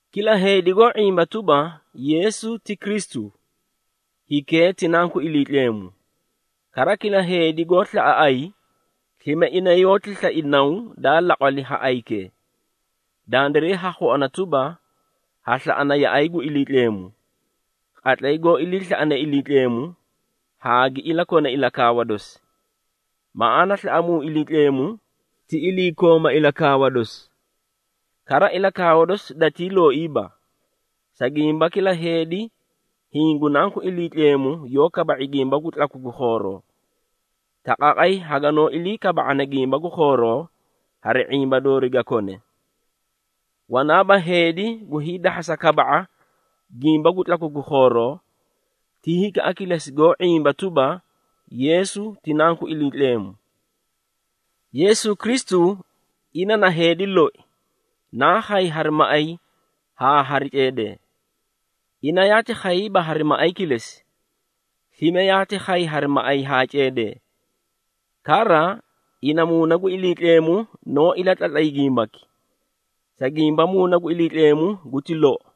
Kila heedi goó ⁄imba tuba, Yeesu ti Kristu, hikee ti nanku Iliitleemu. Kara kila heedi goó slaꞌa ayi, slime ina yoóti slai naw daa laqwali ha ayikee. Dandiray ha khuana tuba, ha slaꞌana yaꞌay gu Iliitleemu, qatlay goó iliislaꞌane Iliitleemu, haa gi iliikona ilakaawa dosi. Maꞌaana slaꞌamuu Iliitleemu, ti iliikooma ilakaawa dosi. Kara, ilakaawa dosi datii looiiba, sa gimba, kila heedi hiĩ gu nanku Iliitleemu yoó kaba⁄i gimba gu tlaku gu khooroo. Taqaaqay haganoó ilii kaba⁄ana gimba gu khooroo, hari ⁄imba doori ga kone. Wanaaba heedi gu hiidahhasa kaba⁄a gimba gu tlaku gu khooroo, ti hikaꞌa kilesi goó ⁄imba tuba, Yeesu ti Nanku Iliitleemu. Yeesu Kristu, ina na heedi loi, naa khay hari maꞌay haa hari ceedee. Ina yaati khayiiba hari maꞌay kilesi, slime yaati khay hari maꞌay haa ceedee. Kara, ina Muuna gu Iliitleemu noó ilatlatlay gimbaki, sa gimba Muuna gu Iliitleemu guti lou.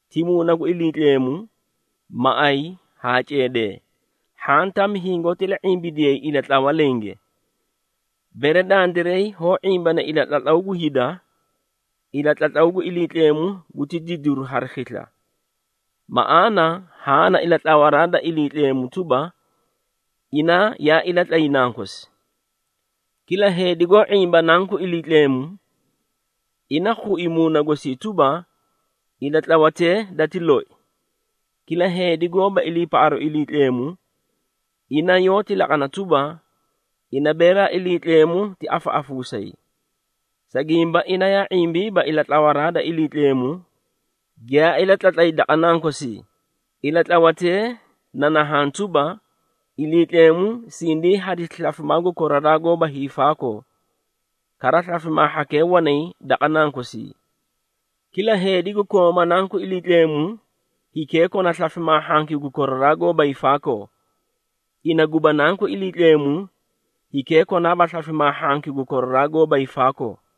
ti Muuna gu Iliitleemu, maꞌay haa ceedee. Hhaã tami hingoóti ila⁄imbidiyay ilatlawa lenge. Bere dandiray hoó ⁄imbana ilatlatlaw gu hida, ilatlatlaw gu Iliitleemu guti didiru hari khisla. Maꞌaana haã na ilatlawaraa da Iliitleemu tuba, ina yaa ilatlatlay Nankosi. Kila heedi goó ⁄imba Nanku Iliitleemu, ina khui muuna gosii tuba, ilatlawatee dati loi. Kila heedi goóba iliipaꞌaru Iliitleemu, ina yoóti laqana tuba, ina beelaa Iliitleemu ti afaꞌafuusayi. Sa gimba ina yaa ⁄imbiiba ilatlawaraa da Iliitleemu giyaa ilatlatlay daqa Nankosii. Ilatlawatee na nahaã tuba, Iliitleemu sindii hadisi slafimaa gu koraraa haa koraraa goóba hiifaakoo, kara, slafimaa hhakee wanay daqa Nankosii. Kila heedi gu kooma Nanku Iliitleemu, hikee kona slafimaa hhanki gu koraraa haa koraraa goóba hiifaakoo. Ina guba Nanku Iliitleemu, hikee konaaba slafimaa hhanki gu koraraa haa koraraa goóba hiifaakoo.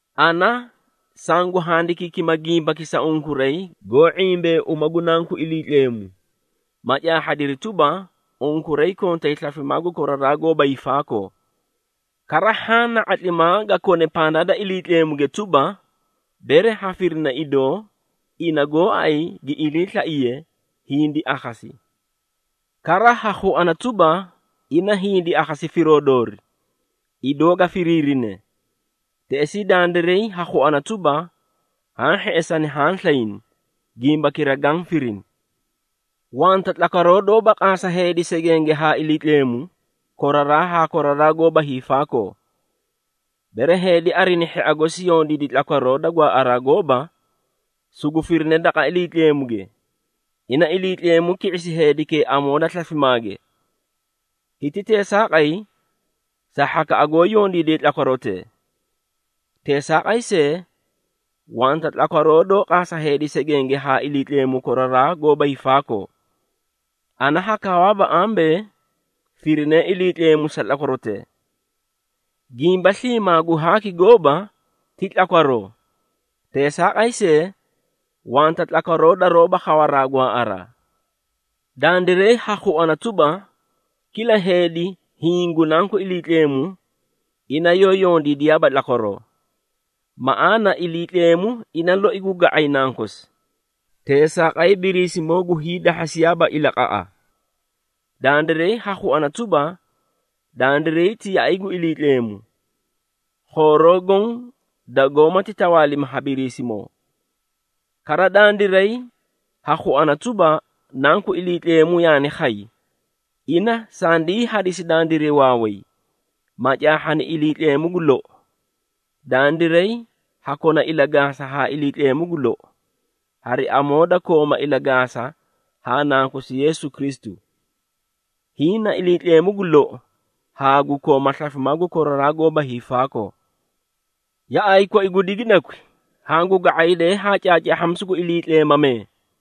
Ana sangu handikiikima gimbaki sa unkuray, goó ⁄imbanee uma gu Nanku Iliitleemu, ma caahhadiri tuba, unkuray kontay slafimaa gu koraraa haa koraraa goóba hiifaakoo. Kara, haã na ⁄atlimaa ga kone pandaa da Iliitleemuge tuba, bere ha firina idoo, ina goóay gi iliislaiye, hindi akhasi. Kara ha khuana tuba, ina hindi akhasi firoo doori, idoo ga firiirine, teꞌesii dandiray ha khuana tuba, haã hheꞌesani haã slayni gimbakira gaã firini. Wanta tlakwaroo doóba qaasa heedi segenge haa Iliitleemu, koraraa haa koraraa haa koraraa goóba hiifaakoo. Bere heedi arina hhia gosi yondiidi tlakwaroo da gwaaꞌaraa gooba, sugu firine daqa Iliitleemuge, ina Iliitleemu ki⁄isi heedikee amoo da slafimaage. Hiti teesaaqay sa hhakaꞌa goó yondiidee tlakwarotee. Teesaaqay see, wanta tlakwaroo doó qaasa heedi segenge haa Iliitleemu koraraa haa koraraa goóba hiifaakoo. Ana ha kaawaaba ambee firine Iliitleemu sa tlakwarotee. Gimba sliimaa gu haaki gooba, ti tlakwaroo, teesaaqay see, wanta tlakwaroo daroóba khawaraa gwaaꞌaraa. Dandiray ha khuana tuba, kila heedi hiĩ gu nanku Iliitleemu, ina yoó yondiidiyaaba tlakwaroo. Maꞌaana, Iliitleemu ina loi gu ga⁄ay nankosi, teesaaqay Biriisimoo gu hiidahhasiyaaba ilaqaꞌa. Dandiray ha khuana tuba, dandiray ti yaꞌay gu Iliitleemu, khooroo goõ dagoómati tawaalimi ha Biriisimoo. Kara, dandiray ha khuana tuba, Nanku Iliitleemu yaani khay, ina sandii hadisi dandiray waaway, ma caahhani Iliitleemu gu lou. Dandiray ha kona ilagaasa haa Iliitleemu gu lou, hari amoo da kooma ilagaasa haa Nankosi Yeesu Kristu. Hiĩ na Iliitleemu gu lou haa gu kooma slafimaa gu koraraa haa koraraa goóba hiifaakoo. Yaꞌay koi gu digidakwi, hangu ga⁄aydee haa caacaahhamisu gu iliitleemamee.